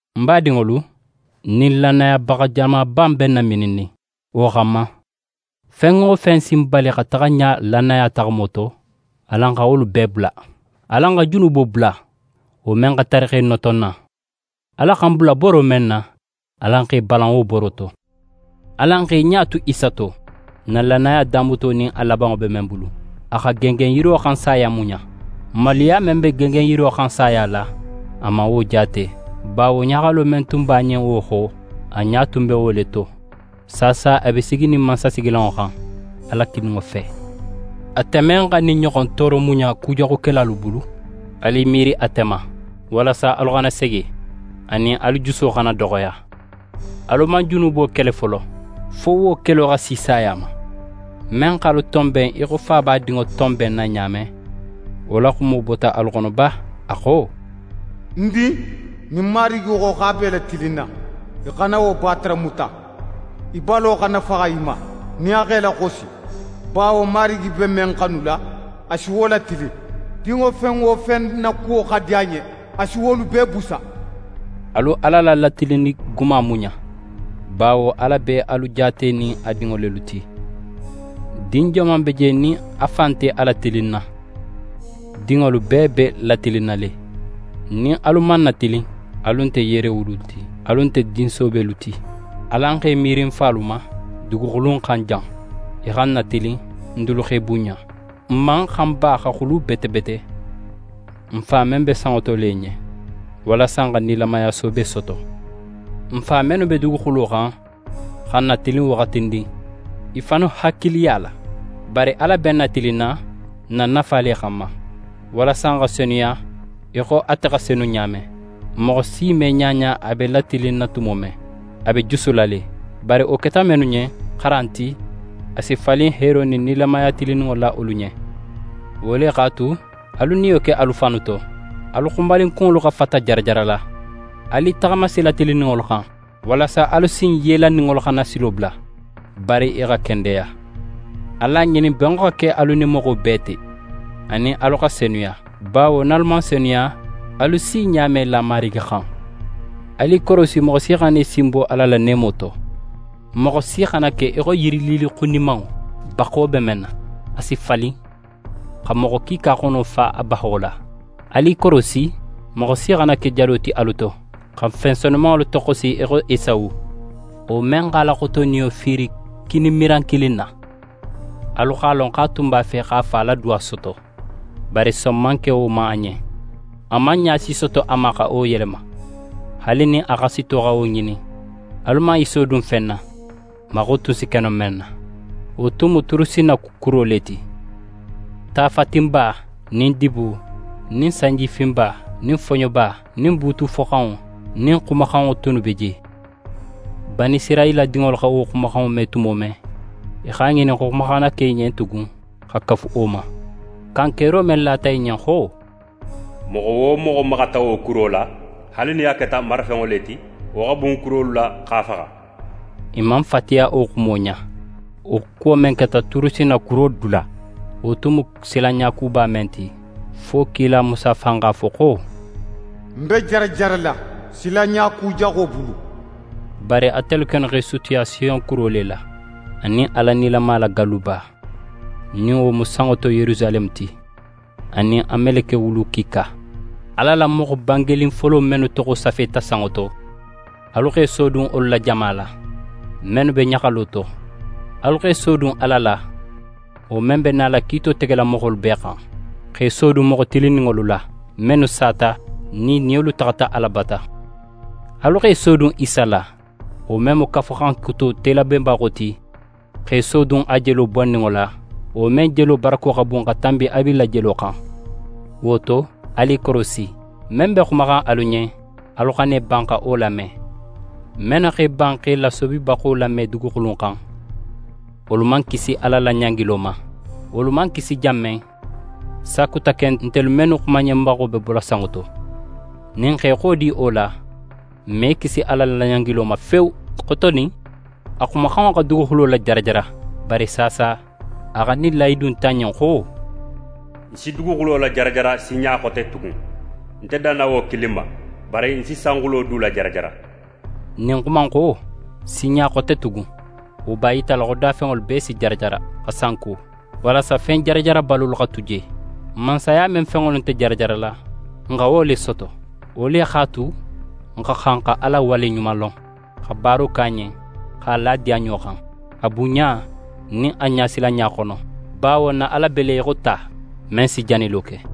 Ń badinŋolu, ɲin lannayabaxa jamaba in be n namininnin. Wo xanma, fen wo fen si n bali xa taxa ɲa lannaya taxamo to, alan xa wolu bee bula. Alan xa junubo bula, wo men xa tari x'é noto n na. Ala xa n bula boro men na, alan x'e balan wo boro to. Alan x'e ɲa tu Isa to, n na lannaya damuto nin a labanŋo be men bulu. A xa gengenyiro xan saya muɲa. Maluya men be gengenyiro xan saya la, a man wo jaate; bawo ɲaxalo men tun b'a ɲen wo xo, a ɲa tun be wo le to. Saasa a be siginin mansasigilanŋo xan, Ala kininŋo fe. Ate men xa ɲin ɲoxon tooro muɲa kujaxukelalu bulu, alu i miiri ate ma, walasa alu xana sege, anin alu juso xana doxoya. Alu man junubo kele folo fo wo kelo xa si saya ma. Men x'alu tonben í xo fa b'a dinŋo tonbenna ɲa men, wo la xumo bota alu xono ba? A xo: «Ń din, nin Marigi xo x'a be í latilinna, í xana wo bataramuta. Í balo xana faxa í ma, nin a x'é laxosi. Bawo Marigi be men xanula, a si wo latilin, dinŋo fen wo fen na kuwo xa di a ɲen, a si wolu bee busa.» Alu Ala la latilinni guma muɲa; bawo Ala be alu jaatenin a dinŋo lelu ti. Din joman be je nin a fa nte a latilinna? Dinŋolu bee be latilinna le. Nin alu man natilin, alu nte yeerewulu ti, alu nte din soobelu ti. Alan x'e miiri n falu ma duguxulu in xan jan. I xa n natilin, n dulu x'e bunɲa. N man xan ba xa xulu bete bete n Fa men be sanŋo to le ɲen, walasa n xa nilamaya soobe soto? N fa mennu be duguxulo xan xa n natilin waxatindin, i fannu hakiliya la; bari Ala be n natilinna n na nafa le xanma, walasa n xa senuya í xo ate xa senu ɲa men. Moxo si me ɲaɲa a be latilinna tumo men, a be jusula le. Bari wo keta mennu ɲen xaran ti, a si falin heero nin nilamaya tilinninŋo la wolu ɲen. Wo le x'a tu, alu niyo ke alu fannu to, alu xunbalinkunŋolu xa fata jarajarala. Alu i taxama sila tilinninŋolu xan; walasa alu sin yellaninŋolu xana silo bula, bari i xa kendeya. Alu a ŋinin benŋo xa ke alu nin moxo bee te, anin alu xa senuya; bawo nin alu man senuya, alu si ɲa me la Marigi xan. Alu i korosi moxo si xana í sinbo Ala la neemo to. Moxo si xana ke í xo yirililli xunimanŋo, baxo be men na. A si falin, xa moxo kiika xono fa a baxo la. Alu i korosi moxo si xana ke jado ti alu to, xa fen senumanŋolu toxosi í xo Esawu, wo men x'a la xotoniyo fiiri kini miran kilin na. Alu x'a lon xo a tun b'a fe x'a fa la duwa soto. Bari son man ke wo ma a ɲen. A man ɲa si soto a ma xa wo yelema, haali nin a xasito xa wo ŋinin. Alu man i sodun fen na, maxo tun si ke no men na. Wo tun mu Turusinna kuro le ti, ta fatinba nin dibo nin sanjifinba nin foɲoba, nin buutu foxanŋo nin xumaxanŋo tunnu be je. Banisirayila dinŋolu xa wo xumaxanŋo me tumo men, i x'a ŋinin xo xuma xana ke i ɲen tugun x'a kafu wo ma. Kankero men lata i ɲen xo: «Moxo wo moxo maxata wo kuro la, haali nin a keta marafenŋo le ti, wo xa bun kurolu la, x'a faxa», i man fatiya wo xumo ɲa. Wo kuwo men keta Turusinna kuro dula, wo tun mu silanɲa kuba men ti, fo kila Musa fan x'a fo xo: «Ń be jarajarala, silanɲa kujaxo bulu.» Bari atelu kennu x'e sutiya Siyon kuro le la, anin Ala nilama la galluba, nin wo mu sanŋo to Yerusaleme ti, anin a meleke wulu kiika. Ala la moxo bangenin folo mennu toxo safeta sanŋo to, alu x'e sodun wolu la jama la, mennu be ɲaxalo to. Alu x'e sodun Ala la, wo men be nala kiito tegela moxolu bee xan, x'e sodun moxo tilinninŋolu la, mennu sata nin i niyolu taxata Ala bata. Alu x'e sodun Isa la, wo men mu Kafuxan Kuto telabenbaxo ti, x'e sodun a jelo bonninŋo la, wo men jelo barako xa bun xa tanbi Abila jelo xan. Wo to, alu i korosi. Men be xumaxan alu ɲen, alu xana i ban xa wo lame. Mennu x'e ban x'e lasobibaxo lame duguxulu in xan, wolu man kisi Ala la ɲangilo ma. Wolu man kisi jan men, sakuta ken ntelu mennu xumanɲenbaxo be bola sanŋo to. Nin n x'e xodi wo la, n me kisi Ala la ɲangilo ma fewu. Xotonin, a xumaxanŋo xa duguxulo lajarajara; bari saasa, a xa ɲin lahidu in ta n ɲen xo: «Ń si duguxulo lajarajara sinɲa xote tugun; nte danna wo kilin ma, bari ń si sanxulo du lajarajara.» Ɲin xuma in xo: «Sinɲa xote tugun», wo b'a yitala xo dafenŋolu bee si jarajara, xa sanko, walasa fen jarajarabalolu xa tu je. Mansaya men fenŋolu nte jarajarala, n xa wo le soto. Wo le x'a tu, n xa xan xa Ala waleɲumalon, xa baaro ke a ɲen, x'a la a diyanɲo xan, a bunɲa nin a ɲasilanɲa xono; bawo n na Ala be le í xo ta, men si janilo ke.